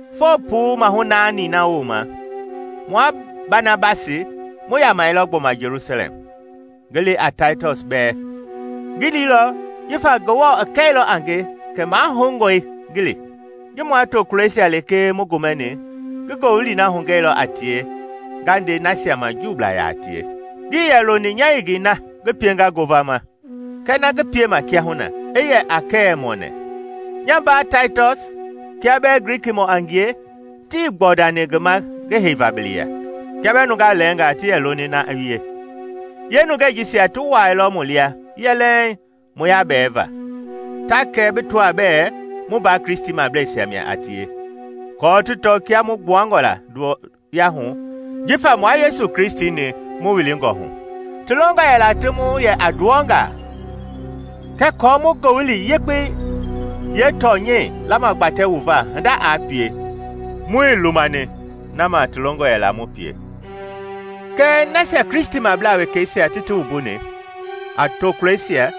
Foo puu maahu naani na wooma, mua Banabasi mu yamɛilɔ gbɔma Jelusalɛm, ngi li a Taitɔs bɛɛ. Ngi liilɔ jifa Ngewɔ i kɛilɔ a nge kɛ mahoungɔe ngi li. Ji mua tokulɔisia lekee mu gomɛni ngi Ngowili na hugɛilɔ a tie nga nde nasia ma Juublaa yaa tie. Ngii yɛ loni nya yengei na ngi pienga ngovama kɛɛ na ngi piema kiahuna i yɛ a kɛɛ-mɔɔnɛ. Nya mbaa Taitɔs, kia bɛɛ Grikimɔ a ngie, tii kpɔndani ngi ma ngi heiva bili ya, kia bɛɛ nungaa lɛɛngaa ti yɛ loni na i wie. Yeenungɛi jisia ti wuaailɔ mu lia yɛlɛŋ mu yabɛɛva, ta kɛ bi tɔaa bɛɛ mu mbaa Kristimableisia mia a tie aako ti tɔ kia mu gbuangɔ la nduwɔyahu jifa mua Yesu Kristi-ni mu wilingɔ hu. Ti longɔ yɛla ti mu yɛ a nduwɔngaa, kɛɛ aako mu Ngowili Yekpei yee tɔnyɛi lamagbatɛ wu va hinda aa pie, muii lumani na ma ti longɔ yɛla mu pie. Kɛɛ nasia Kristimablaa wekeisia ti ti wumbuni, a tokulɔisia,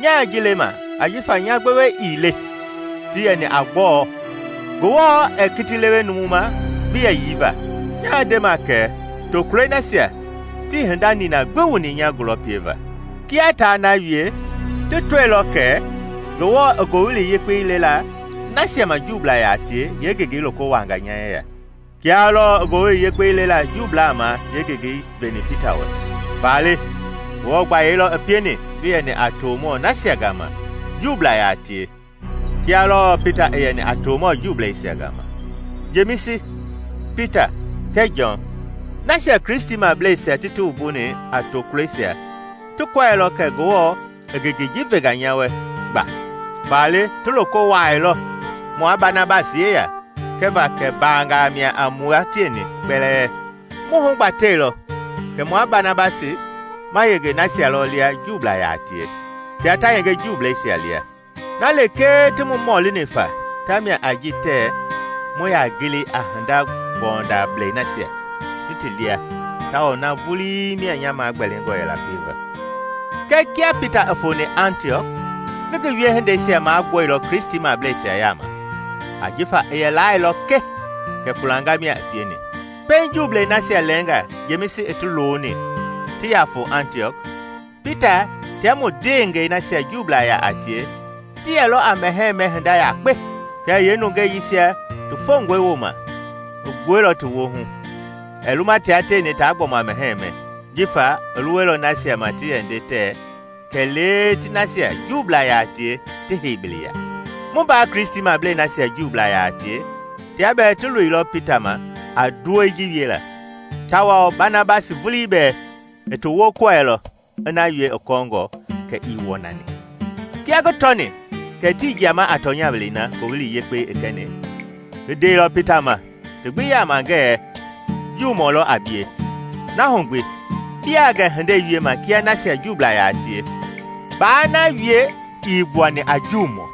nyaa ji lema ajifa nya gbewe ii le ti yɛni a gbɔɔ; Ngewɔ ɛɛ kiti lewe numu ma bi yɛyii va; nyaa ndema kɛ, tokulɔi nasia tii hinda nina gbi wuni nya gulɔ pieva. Kia taa na wie, ti tɔilɔ kɛ Ngewɔ i Ngowili Yekpei lela nasia ma Juublaa yaa tie yeengengei loko wuaanga nya yeya, kia lɔɔ i Ngowili Yekpei lela Juublaa ma yeengengei veni Pita wɛ. Faale Ngewɔ gbayei lɔ i pieni ngi yɛni a tomɔ nasia gama Juublaa yaa tie kia lɔɔ Pita i yɛni a tomɔ Juubleisia gama. Jemisi, Pita kɛɛ Jɔn, nasia Kristimableisia ti ti wumbuni a tokulɔisia ti kɔɛilɔ kɛ Ngewɔ i ngengei ji venga nya wɛ gba; faale ti loko wuaailɔ mua Banabasi yeya kɛva kɛ mbaanga mia a mua tieni kpɛlɛɛ. Mu hugbatɛilɔ kɛ mua Banabasi ma yenge nasia lia lɔ Juublaa yaa tie, tia ta yenge Juubleisia lia. Na lekee ti mu mɔlini fa tamia a ji tɛɛ mu yaa gili a hinda-gbɔundablei nasia ti ti lia tawao na vulii mia nya magbɛlingɔ yɛla pieva. Kɛɛ kia Pita i foni Antiɔk, ngi ngi wiehindei magbuɛilɔ Kristimableisia yaama ajifa i yɛ laailɔ ke kɛ kpulanga mia i pieni. Pɛiŋ Juublei nasia lɛnga Jemisi i ti looni ti yaa foo Antiɔk, Pita tia mu ndeengɛi nasia Juublaa yaa a tie ti yɛlɔ a mɛhɛɛ mɛ hinda yakpe. Kɛɛ yeenungeisia ti fongɔi wooma, i gbuɛilɔ ti woohu, ɛɛ luma tia tieni taa gbɔma mɛhɛɛ mɛ jifa i luwɛilɔ nasia ma ti yɛ nde tɛɛ kɛlee ti nasia Juublaa yaa tie ti hei bili ya. Mu mbaa Kristimablei nasia Juublaa a tie tia bɛɛ ti toilɔ Pita ma a nduwɛi ji wiela, tawao Banabasi vulii bɛɛ i ti wokɔɛilɔ i na wie i kɔɔngɔ kɛ ii wɔnani. Kia ngi tɔni kɛ tii jiama a tɔnya welei na Ngowili Yekpei i kɛni, ngi ndeilɔ Pita ma ti gbi yaama ngɛɛ, “Juumɔ lɔ a bie, na hu gbi biaa gɛ hindei wiema kia nasia Juublaa yaa tie, ba na wie ii gbuani a Juumɔ.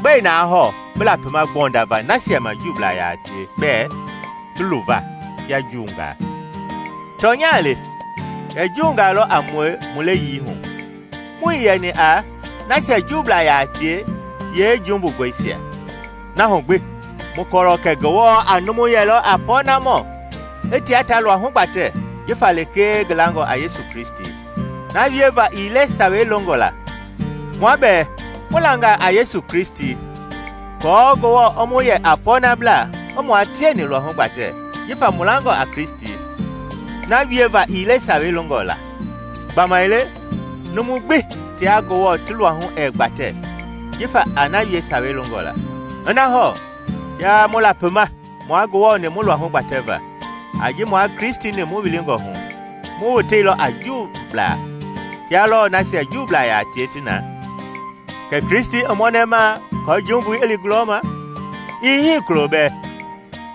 Gbɛe na hɔɔ bi lapima kpɔndava nasia ma Juublaa yaa tie bɛɛ ti luva kia Juungaa?” Tɔnya le kɛ Juungaa lɔ a mue mu leyii hu, muii yɛni a “Nasia Juublaa yaa tie yee jumbungɔisia”. Na hu gbi mu kɔɔlɔ kɛ Ngewɔ a numu yɛlɔ a pɔɔnamɔ i tia ta luahu gbatɛ jifa lekee ngi langɔ a Yesu Kristi, na wieva ii le Sawei longɔ la. Mua bɛɛ mu langa a Yesu Kristi aako Ngewɔ i mu yɛ a pɔɔnablaa i mua tieni luahu gbatɛ jifa mu langɔ a Kristi, na wieva ii le Sawei longɔ la. Gbamaile numu gbi tia Ngewɔ ti luahu ɛɛ gbatɛ jifa a na wie Sawei longɔ la. Ina hɔɔ kia mu lapima mua Ngewɔ-ni mu luahu gbatɛva a ji mua Kristi-ni mu wilingɔ hu, mu woteilɔ a “Jumbublaa,” kia lɔɔ nasia Juublaa yaa tie ti na, kɛ Kristi i mɔnɛma aako jumbui i li gulɔma? Ii hii kulo bɛɛ!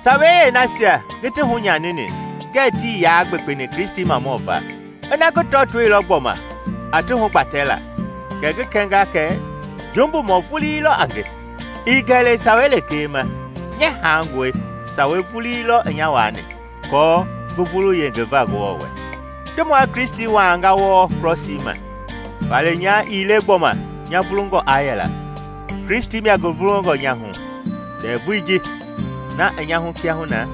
Sawei yeenasia ngi ti hunyanini ngɛɛ tii yaa gbekpeni Kristimamɔ va, ina ngi tɔɔtoilɔ gbɔma a ti hugbatɛla, kɛ ngi kɛnga kɛ jumbumɔ vulii lɔ a nge. I gɛlɛ Sawei lekee ma, nya haangɔe, Sawei vulii lɔ i nya waani, aako ngi vulu yengeva Ngewɔ wɛ. Ti mua Kristi waanga wɔɔ krɔsii ma, faale nya ii le gbɔma nya vulungɔ aa yɛla, Kristi mia ngi vulungɔ nya hu. Ndɛvui ji na i nya hu kiahuna,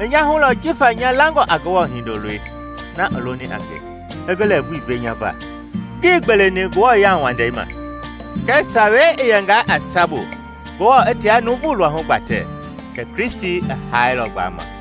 i nya hu lɔ jifa nya langɔ a Ngewɔ Hindoloi na i loni a nge, i ngi lɛɛvui ve nya va. Ngii gbeleni Ngewɔ yauwandei ma. Kɛɛ Sawei i yɛngaa a sabu Ngewɔ i tia numu luahu gbatɛ, kɛ Kristi i haailɔ gbama.